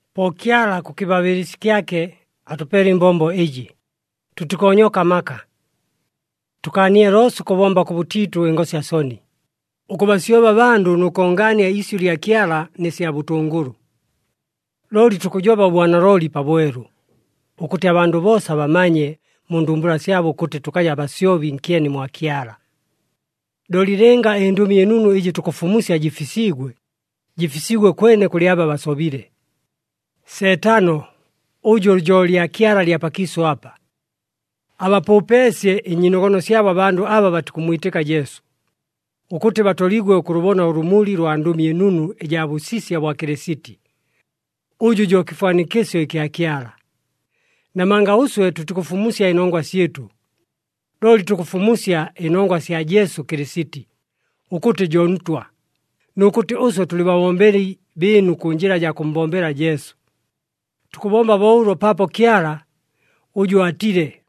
Po Kyala kʉ kɨbabɨɨlɨsi kyake atʉpeele ɨmbombo ɨjɨ, tʉtikoonyoka amaka. Tʉkaanile loosa ʉkʉbomba kʉbʉtiitʉ ɨngosya soni, ʉkʉbasyoba abandʉ nʉ kongaania iisyʉ lya Kyala nɨ sya bʉtʉngʉlʉ. Looli tukʉjoba ʉbwanalooli pabwelu, ʉkʉtɨ abandʉ boosa bamanye mu ndumbula syabo ʉkʉtɨ tʉkaja basyobi nkyeni mwa Kyala. Looli lɨnga ɨNdʉmi ɨNunu ɨjɨ tukʉfumusya jɨfisiigwe, jɨfisiigwe kwene kʉlɨ aba basobile. Seetano, ʉjʉ jo lyakyala lya pakiisʉ apa, abapʉʉpeesye ɨnyiinogono syabo abandʉ aba batikʉmmwitɨka Jesu, ʉkʉtɨ batoligwe ʉkʉlʉbona ʉlʉmuli lwa Ndʉmi ɨNunu ɨjaa bʉsisya bwa Kɨlɨsiti, ʉjʉ jo kɨfwanikɨsyo ɨkya Kyala. Namanga ʉswe tʉtikʉfumusya ɨnongwa syɨtʉ, looli tukʉfumusya ɨnongwa ɨsya Jesu Kɨlɨsiti, ʉkʉtɨ jo Ntwa, nʉ kʉtɨ ʉswe tʉlɨ babombeli bɨɨnu kʉ njɨla jaa kʉmmbombela Jesu. Tukʉbomba bo ʉlo paapo Kyala, ʉjʉ aatile,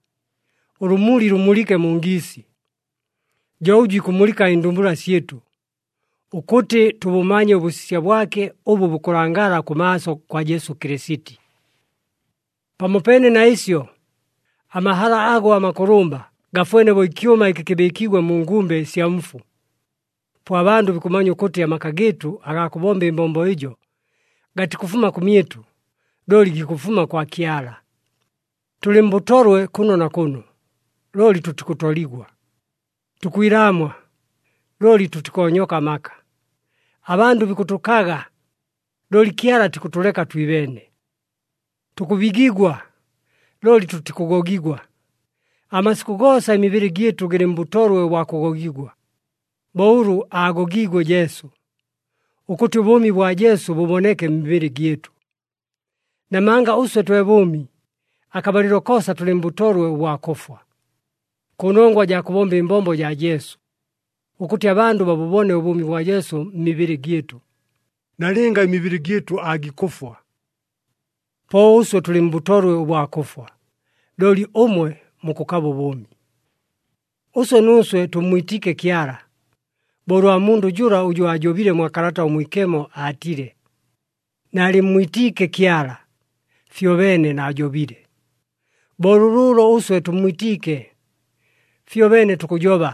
“Ʉlʉmuli lʉmulɨke mu ngiisi,” jo ʉjʉ ikʉmulɨka ɨndumbula syɨtʉ, ʉkʉtɨ tʉbʉmanye ʉbʉsisya bwake ʉbʉ bukʉlangala kʉmaaso kwa Jesu Kɨlɨsiti. Pamopeene na ɨsyo, amahala ago amakʉlʉmba gafwene bo ɨkyʉma ɨkɨ kɨbɨɨkiigwe mu ngumbe ɨsya mfu. Po abandʉ bikʉmanya ʉkʉtɨ amaka gɨɨtʉ agaa kʉbomba ɨmbombo ɨjo, gatikʉfuma kʉmyɨtʉ, looli gikʉfuma kwa Kyala. Tʉlɨ mbʉtolwe kʉno na kʉno, looli tʉtikʉtoligwa. Tukwilaamwa, looli tʉtikoonyoka amaka. Abandʉ bikʉtʉkaga, looli Kyala atikʉtʉleka twibeene. Tukʉbigigwa, looli tʉtikʉgogigwa. Amasikʉ goosa ɨmibɨlɨ gyɨtʉ gɨlɨ mbʉtolwe ʉbwa kʉgogigwa, bo ʉlʉ aagogiigwe Jesu, ʉkʉtɨ ʉbʉʉmi bwa Jesu bʉboneke mmibɨlɨ gyɨtʉ. Namanga ʉswe twe bʉʉmi, akabalɨlo koosa tʉlɨ mbʉtolwe ʉbwa kʉfwa, kʉnongwa jaa kʉbomba ɨmbombo jaa Jesu, ʉkʉtɨ abandʉ babʉbone ʉbʉʉmi bwa Jesu mmibɨlɨ gyɨtʉ, nalɨnga ɨmibɨlɨ gyɨtʉ aagikʉfwa. Po ʉswe tʉlɨ mbʉtolwe ʉbwa kʉfwa, looli ʉmwe mukʉkaba ʉbʉʉmi. Ʉswe nuuswe tʉmmwitiike Kyala, bo ʉlwa mundʉ jʉla ʉjʉ aajobile mwa Kalata ʉMwikemo, aatile, “Naalɨmmwitiike Kyala, fyobeene naajobile.” Bo lʉlʉʉlo, ʉswe tʉmmwitiike. Fyobeene tukʉjoba.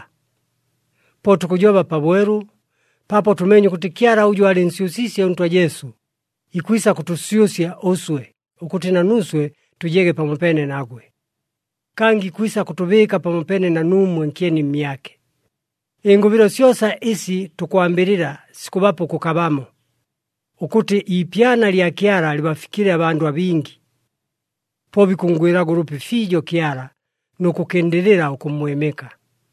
Po tukʉjoba pabwelu, paapo tʉmeenye ʉkʉtɨ Kyala ʉjʉ aalɨnsyʉsiisye ʉNtwa Jesu, ikwisa kʉtʉsyʉsya ʉswe, ʉkʉtɨ na nuuswe tʉjege pamopeene nagwe. Kangɨ ikwisa kʉtʉbɨɨka pamopeene na nuumwe nkyeni mmyake. Ɨngʉbɨlo ɨsi syosa ɨsi tukwambɨlɨla sikʉbapa ʉkʉkabamo, ʉkʉtɨ iipyana lya Kyala lɨbafikɨle abandʉ abingi. Po bikʉnngwɨlaga ʉlʉpi fiijo Kyala, nʉ kʉkɨndɨlɨla ʉkʉmmwɨmɨka.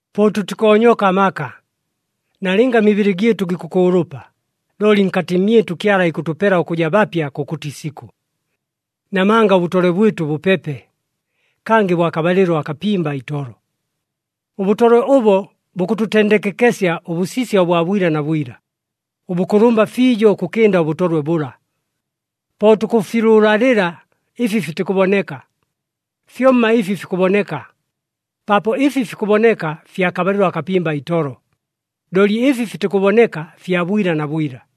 Po tʉtikoonyoka amaka, nalɨnga ɨmibɨlɨ gyɨtʉ gikʉkʉʉlʉpa, looli nkatɨ mmyɨtʉ Kyala ikʉtʉpela ʉkʉja bapya kʉkʉtɨ isikʉ. Namanga ʉbʉtolwe bwɨtʉ bʉpepe, kangɨ bwa kabalɨlo akapimba itolo. Ʉbʉtolwe ʉbo, bukʉtʉtendekekesya ʉbʉsisya ʉbwa bwila na bwila, ʉbʉkʉlʉmba fiijo ʉkʉkɨnda ʉbʉtolwe bʉla. Po tukʉfilʉʉlalɨla ɨfi fitikʉboneka, fyomma ɨfi fikʉboneka, paapo ɨfi fikʉboneka fya kabalɨlo akapimba itolo, looli ɨfi fitikʉboneka fya bwila na bwila.